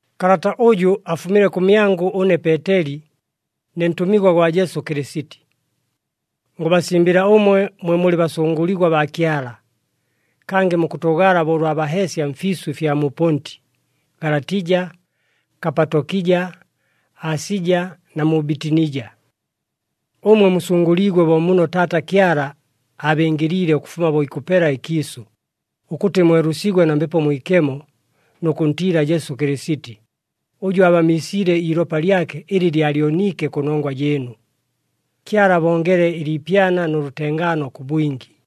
Kalata ʉjʉ afumile kʉmyangʉ ʉne Peeteli, ne ntʉmigwa gwa Jesu Kɨlɨsiti. Ngʉbasimbɨla ʉmwe mwe mulɨ basʉngʉligwa baa Kyala, kangɨ mukʉtʉʉgala bo ʉlwa baheesya mfiisʉ ɨfya mu Ponti, Galatija, Kapatokija, Asija na mu Bitinija. Ʉmwe musʉngʉliigwe bo muno Taata Kyala aabɨngɨliile ʉkʉfuma bo ikʉpela ɨkiisʉ, ʉkʉtɨ mwelʉsigwe na Mbepo Mwikemo nʉ kʉntiila Jesu Kɨlɨsiti, ʉjʉ aabamiisiile iilopa lyake ɨlɨ lyalyoniike kʉnongwa jɨɨnu. Kyala abongele ɨliipyana nʉ lʉtengaano kʉ bwingi.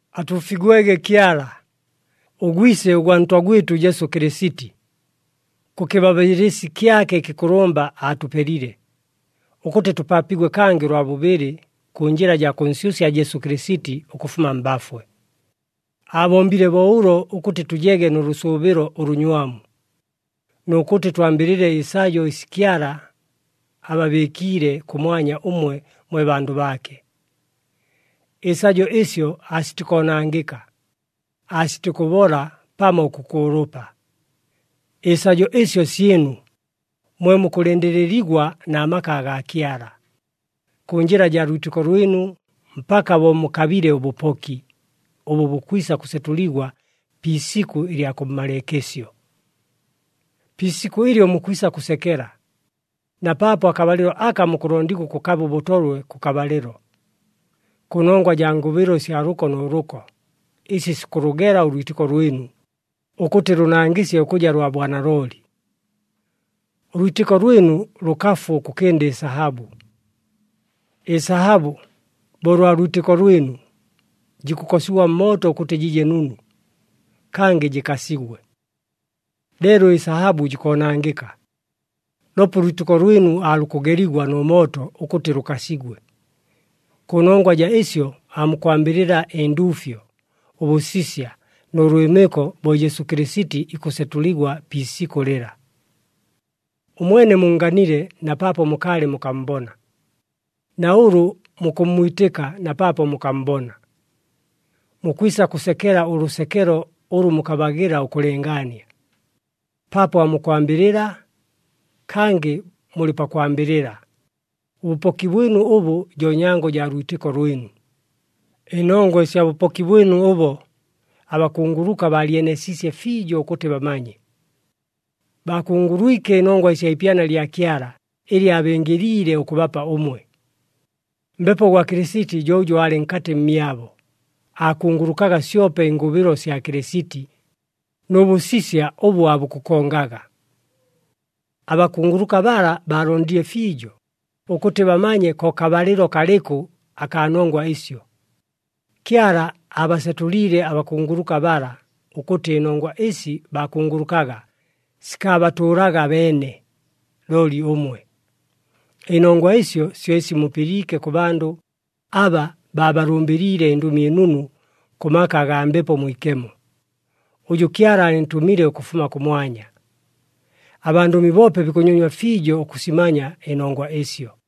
Atuufigwege Kyala, ʉGwise ʉgwa Ntwa gwɨtʉ Jesu Kɨlɨsiti! Kʉ kɨbabɨɨlɨsi kyake ɨkɨkʉlʉmba aatʉpelile, ʉkʉtɨ tʉpaapigwe kangɨ ʉlwa bʉbɨlɨ, kʉ njɨla jaa kʉnsyʉsya Jesu Kɨlɨsiti ʉkʉfuma mbafwe. Aabombile bo ʉlo ʉkʉtɨ tʉjege nʉ lʉsʉʉbɨlo ʉlʉnywamu, nʉ kʉtɨ twambɨlɨle ɨsajo ɨsi Kyala ababɨɨkiile kʉmwanya ʉmwe mwe bandʉ baake. Ɨsajo ɨsyo aasitikoonangɨka, aasitikʉbola pamo ʉkʉkʉʉlʉpa. Ɨsajo ɨsyo syɨnu, mwe mukʉlɨndɨlɨligwa na maka agaa Kyala, kʉ njɨla jaa lwitɨko lwɨnu mpaka bo mukabile ʉbʉpoki, ʉbʉ bukwisa kʉsetʉligwa pi isikʉ ɨlya kʉmmalɨɨkɨsyo. Pi isikʉ ɨlyo mukwisa kʉsekela, na paapo akabalɨlo aka mukʉlondigwa ʉkʉkaba ʉbʉtolwe kʉkabalɨlo, kʉnongwa jaa ngʉbɨlo ɨsya lʉko nʉ lʉko, ɨsi sikʉlʉgela ʉlwitɨko lwɨnu, ʉkʉtɨ lʉnangɨsye ʉkʉja lwa bwanalooli. Ʉlwitɨko lwɨnu lʉkafu ʉkʉkɨnda ɨsahabʉ. Ɨsahabʉ, bo ʉlwa lwitɨko lwɨnu, jikʉkosigwa mmooto ʉkʉtɨ jɨje nunu, kangɨ jɨkasigwe. Leelo ɨsahabʉ jikoonangɨka. Loope ʉlwitɨko lwɨnu aalukʉgeligwa nʉ mooto ʉkʉtɨ lʉkasigwe. Kʉnongwa jaa ɨsyo aamukwambɨlɨla ɨnduufyo, ʉbʉsisya nʉ lwɨmɨko bo Jesu Kɨlɨsiti ikʉsetʉligwa pi isikʉ lɨla. Ʉmwene munnganile na paapo mukaalɨ mukammbona, na ʉlʉ mukʉmmwitɨka na paapo mukammbona. Mukwisa kʉsekela ʉlʉsekelo ʉlʉ mukabagɨla ʉkʉlɨngaania, paapo aamukwambɨlɨla, kangɨ mulɨ pakwambɨlɨla, ʉbʉpoki bwɨnu ʉbʉ jo nyango jaa lwitɨko lwɨnu. Ɨnongwa ɨsya bʉpoki bwɨnu ʉbo, abakunguluka baalyeneesiisye fiijo ʉkʉtɨ bamanye. Baakungulwike ɨnongwa ɨsya ipyana lya Kyala ɨlɨ aabɨngɨliile ʉkʉbapa ʉmwe. Mbepo gwa Kɨlɨsiti jo ʉjʉ aalɨ nkatɨ mmyabo, aakungulukaga syope ɨngʉbɨlo sya Kɨlɨsiti, nʉ bʉsisya ʉbʉ aabukʉkongaga. Abakunguluka bala baalondile fiijo, ʉkʉtɨ bamanye ko kabalɨlo kalɨkʉ akaa nongwa ɨsyo. Kyala aabasetʉliile abakunguluka bala, ʉkʉtɨ ɨnongwa ɨsi baakungulukaga sikaabatʉʉlaga abeene, looli ʉmwe. Ɨnongwa ɨsyo syo ɨsi mupɨliike kʉ bandʉ aba baabalʉmbɨliile ɨNdʉmi ɨNunu kʉ maka agaa Mbepo Mwikemo, ʉjʉ Kyala aalɨntʉmile ʉkʉfuma kʉmwanya. Abandʉmi boope bikʉnyonywa fiijo ʉkʉsimanya ɨnongwa ɨsyo.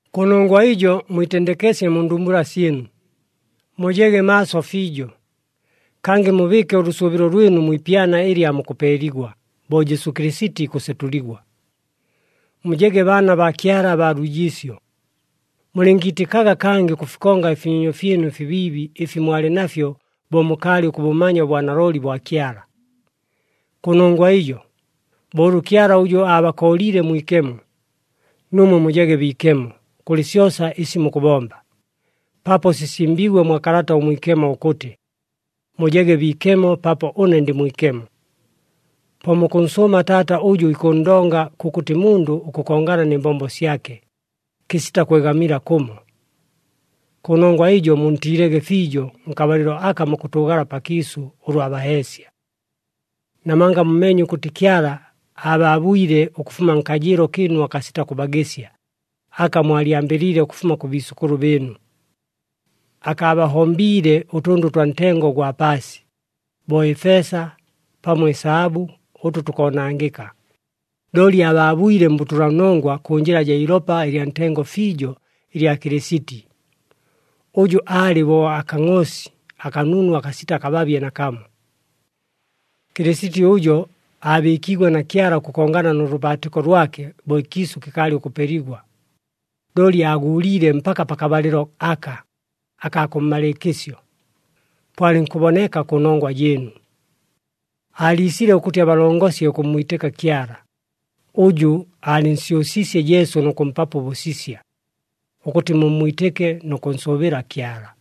Kʉnongwa ɨjo mwitendekesye mu ndumbula syɨnu, mujege maaso fiijo, kangɨ mubɨɨke ʉlʉsʉʉbɨlo lwɨnu mwi ipyana ɨlɨ aamukʉpeeligwa bo Jesu Kɨlɨsiti ikʉsetʉligwa. Mujege baana baa Kyala abaa lwijiisyo. Mulɨngiitɨkaga kangɨ ʉkʉfikonga ɨfinyonyo fyɨnu ɨfibiibi ɨfi mwalɨ nafyo bo mukaalɨ ʉkʉbʉmanya ʉbwanalooli bwa Kyala. Kʉnongwa ɨjo, bo ʉlʉ Kyala ʉjʉ abakooliile mwikemo, nuumwe mujege biikemo kʉlɨ syosa ɨsi mukʉbomba, paapo sisimbiigwe mwa Kalata ʉMwikemo ʉkʉtɨ, “Mujege biikemo paapo ʉne ndɨ mwikemo.” Po mukʉnsʉʉma Taata ʉjʉ ikʉnndonga kʉkʉtɨ mundʉ ʉkʉkongana nɨ mbombo syake, kɨsita kwegamila kʉmo. Kʉnongwa ɨjo muntiilege fiijo nkabalɨlo aka mukʉtʉʉgala pakiisʉ ʉlwa baheesya. Namanga mumeenye ʉkʉtɨ Kyala aabaabwile ʉkʉfuma nkajɨɨlo kɨɨnu akasita kʉbagɨsya, aka mwalyambɨliile ʉkʉfuma kʉ biisʉkʉlʉ bɨɨnu. Akaabahombiile ʉtʉndʉ ʉtwa ntengo ʉgwa paasi, bo ɨfeesa pamo ɨsahabʉ ʉtʉ tukoonangɨka, looli aabaabwile mbʉtʉlanongwa kʉ njɨla jaa ilopa ɨlya ntengo fiijo ɨlya Kɨlɨsiti, ʉjʉ aalɨ bo akangʼoosi akanunu akasita kababye nakamo. Kɨlɨsiti ʉjo aabɨɨkiigwe na Kyala ʉkʉkongana nʉ lʉbaatɨko lwake bo ɨkiisʉ kɨkaalɨ ʉkʉpeligwa, looli aaguuliile mpaka pakabalɨlo aka, akaa kʉmmalɨɨkɨsyo, po alɨnkʉboneka kʉnongwa jɨɨnu. Aaliisile ʉkʉtɨ abalongosye ʉkʉmmwitɨka Kyala, ʉjʉ aalɨnsyʉsiisye Jesu nʉ kʉmpapo ʉbʉsisya, ʉkʉtɨ mummwitɨke nʉ kʉnsʉʉbɨla Kyala.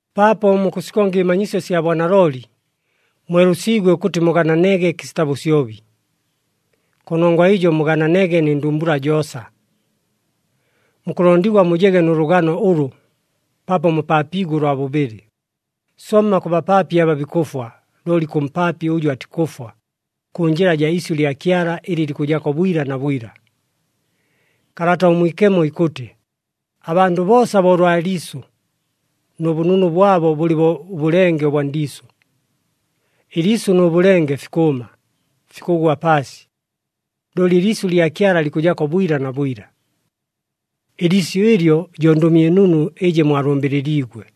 Paapo mukʉsikonga ɨmanyisyo sya bwanalooli, mwelʉsiigwe ʉkʉtɨ mugananege kɨsita bʉsyobi. Kʉnongwa ɨjo mugananege nɨ ndumbula joosa. Mukʉlondigwa mujege nʉ lʉgano ʉlʉ, paapo mupaapiigwe ʉlwa bʉbɨlɨ, somma kʉ bapaapi aba bikʉfwa looli kʉ mpaapi ʉjʉ atikʉfwa, kʉ njɨla jaa isyʉ lya Kyala ɨlɨ likʉjako bwila na bwila. Kalata ʉMwikemo ikʉtɨ, “Abandʉ boosa bo ʉlwa liisʉ, nʉ bʉnunu bwabo bʉlɨ bo ʉbʉlenge ʉbwa ndiisʉ. Ɨliisʉ nʉ bʉlenge fikʉʉma, fikʉgwa paasi, looli ɨliisyʉ lya Kyala likʉjako bwila na bwila.” Ɨliisyʉ ɨlyo jo Ndʉmi ɨNunu ɨjɨ mwalʉmbɨlɨliigwe.